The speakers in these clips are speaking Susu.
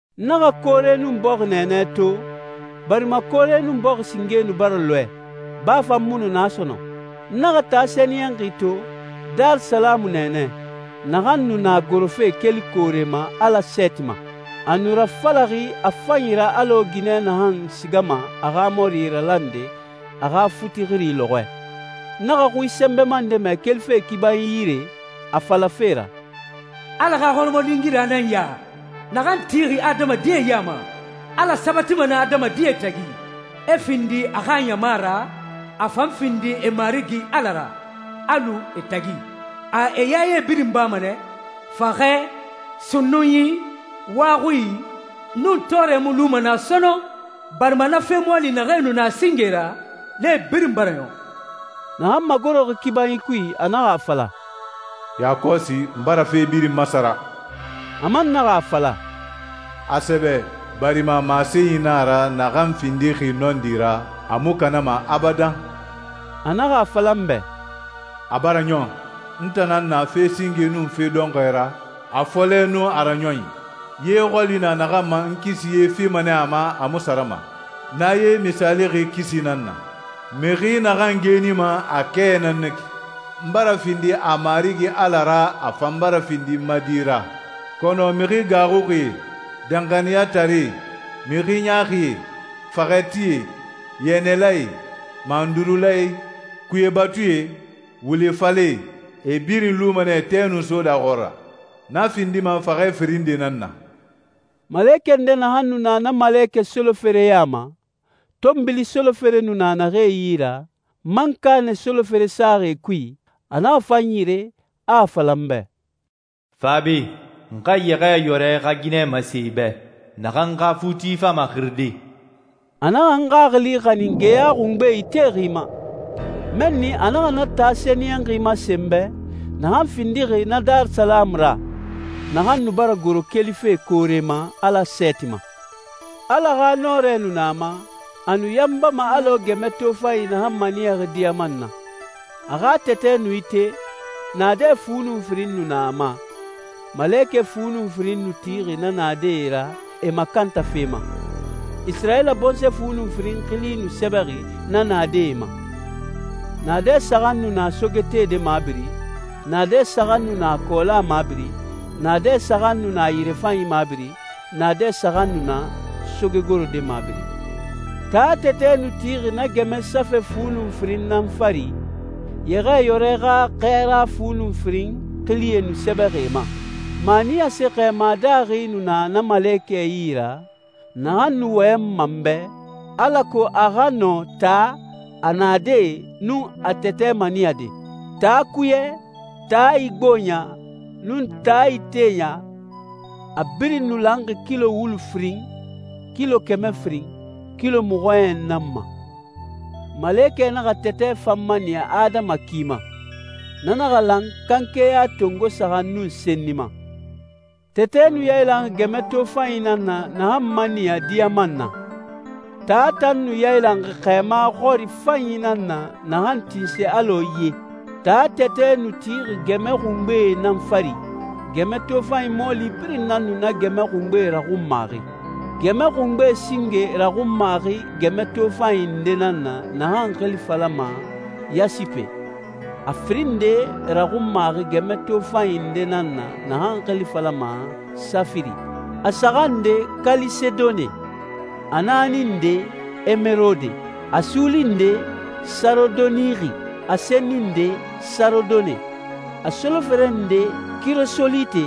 N naxa koore nun bɔxi nɛɛnɛ to, barima koore nun bɔxi singe nu bara lɔɛ, baa fan mu nu na sɔnɔn. N naxa taa sɛniyɛnxi to, Darisalamu nɛɛnɛ, naxan nu na gorofe keli koore ma Ala sɛɛti ma. A nu rafalaxi a fanyi ra alɔ ginɛ naxan sigama a xa mɔri ralande a xa futi xiri lɔxɔɛ. N naxa xui sɛnbɛma nde mɛ kelife kibanyi yire, a falafe ra, «Ala xa hɔrɔmɔlingira nan ya naxan tixi adamadie ya ma. Ala sabatima nɛ adamadie tagi, e findi a xa ɲama ra, a fan findi e Marigi Ala ra, a lu e tagi. A e yaye birin bama nɛ. Faxɛ, sunnunyi, wa xui, nun tɔɔrɛ mu luma naa sɔnɔn, barima na fe mɔɔli naxee nu na singe ra, nee birin bara ɲɔn.» Naxan magoroxi kibanyi kui a naxa a fala, «Yakɔsi, n bara fe birin masara.» A man naxa a fala, «A sɛbɛ, barima masenyi na a ra naxan findixi nɔndi ra, a mu kanama abadan.» A naxa a fala n bɛ, «A bara ɲɔn. N tan nan na fe singe nun fe dɔnxɔɛ ra, a fɔlɛ nun a raɲɔnyi. Ye xɔli na naxan ma, n kisi ye fima nɛ a ma, a mu sarama. Na ye misaalixi kisi nan na. Mixi naxan geenima, a kɛ nan na ki. N bara findi a Marigi Ala ra, a fan bara findi n ma di ra. Kɔnɔ mixi gaaxuxie, danxaniyataree, mixi ɲaaxie, faxɛtie, yɛnɛlae, mandurulae, kuye batuie, wule falɛe, e birin luma nɛ tɛ nun soda xɔɔra. Na findima faxɛ firin nde nan na.» Malekɛ nde naxan nu na na malekɛ solofere ya ma, tɔnbili solofere nu na naxee yi ra, mankanɛ solofere saxi e kui, a naxa fa n yire, a a fala n bɛ, «Fa be, n xa Yɛxɛɛyɔrɛ xa ginɛ masen i bɛ, naxan xa futi fama xiride.» A naxa n xaxili xanin geya xungbe itexi ma. Mɛnni a naxa na taa sɛniyɛnxi masen n bɛ, naxan findixi na Darisalamu ra, naxan nu bara goro kelife koore ma Ala sɛɛti ma. Ala xa nɔrɛ nu na a ma, a nu yanbama alɔ gɛmɛ tofanyi naxan maniyaxi diyaman na. A xa tɛtɛ nu ite, naadɛ fu nu firin nu na a ma, malekɛ fu nun firin nu tixi na naadɛe ra e makantafe ma. Isirayila bɔnsɔɛ fu nun firin xili nu sɛbɛxi na naadɛe ma. Naadɛ saxan nu na sogetede mabiri, naadɛ saxan nu na kɔɔla mabiri, naadɛ saxan nu na yirefanyi mabiri, naadɛ saxan nu na sogegorode mabiri. Taa tɛtɛ nu tixi na gɛmɛ safɛ fu nun firin nan fari, Yɛxɛɛyɔrɛ xa xɛɛra fu nun firin xilie nu sɛbɛxi e ma. Maniyase xɛɛma daaxi nu na na malekɛ yi ra, naxan nu wɔyɛnma n bɛ, alako a xa nɔ taa, a naadɛe, nun a tɛtɛ maniyade. Taa kuyɛ, taa igboɲa, nun taa iteya, a birin nu lanxi kilo wulu firin, kilo kɛmɛ firin, kilo mɔxɔɲɛn nan ma. Malekɛ naxa tɛtɛ fan maniya adama ki ma. Na naxa lan kanke ya tongo saxan nun senni ma. Tɛtɛ nu yailanxi gɛmɛ tofanyi nan na naxan maniya diyaman na. Taa tan nu yailanxi xɛɛma xɔri fanyi nan na naxan tinse alɔ ye. Taa tɛtɛ nu tixi gɛmɛ xungbee nan fari. Gɛmɛ tofanyi mɔɔli birin nan nu na gɛmɛ xungbee raxunmaxi. Gɛmɛ xungbe singe raxunmaxi gɛmɛ tofanyi nde nan na naxan xili falama yasipe, a firin nde raxunmaxi gɛmɛ tofanyi nde nan na naxan xili falama safiri, a saxan nde kalisedone, a naani nde emerode, a suuli nde sarodonixi, a senni nde sarodone, a solofere nde kirosolite,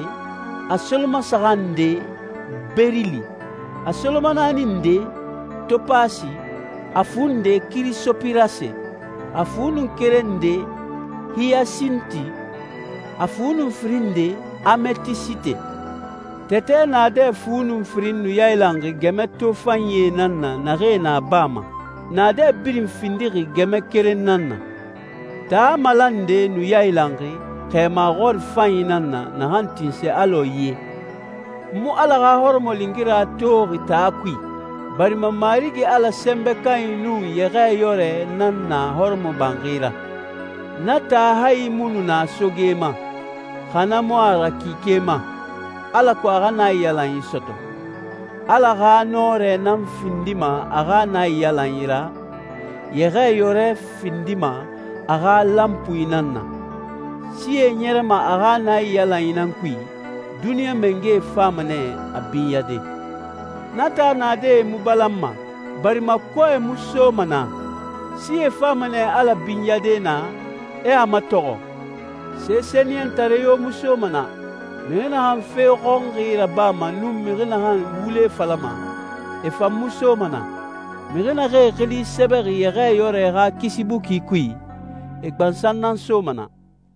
a solomasaxan nde berili, a solomanaani nde topasi, a fu nde kirisopirase, a fu nun keren nde hiyasinti, a fu nun firin nde ametisite. Tɛtɛ naadɛ fu nun firin nu yailanxi gɛmɛ tofanyie nan na naxee na baa ma. Naadɛ birin findixi gɛmɛ keren nan na. Taa malande nu yailanxi xɛɛma xɔri fanyi nan na naxan tinse alɔ ye. N mu Ala xa hɔrɔmɔlingira toxi taa kui, barima Marigi Ala Sɛnbɛ Kanyi nun Yɛxɛɛyɔrɛ nan na hɔrɔmɔbanxi ra. Na taa hayi mu nu na soge ma, xa na mu a ra kike ma, alako a xa naiyalanyi sɔtɔ. Ala xa nɔrɛ nan findima a xa naiyalanyi ra, Yɛxɛɛyɔrɛ findima a xa lanpui nan na. Sie ɲɛrɛma a xa naiyalanyi nan kui, duniɲa mangɛe fama nɛ a binyade. Na taa naadɛe mu balanma, barima kɔɛ mu soma naa. Sie fama nɛ Ala binyade naa, e a matɔxɔ. Se sɛniyɛntare yo mu soma naa, mixi naxan fe xɔnxi rabama nun mixi naxan wule falama, e fan mu soma naa. Mixi naxee xili sɛbɛxi Yɛxɛɛyɔrɛ xa kisi buki kui, e gbansan nan soma na.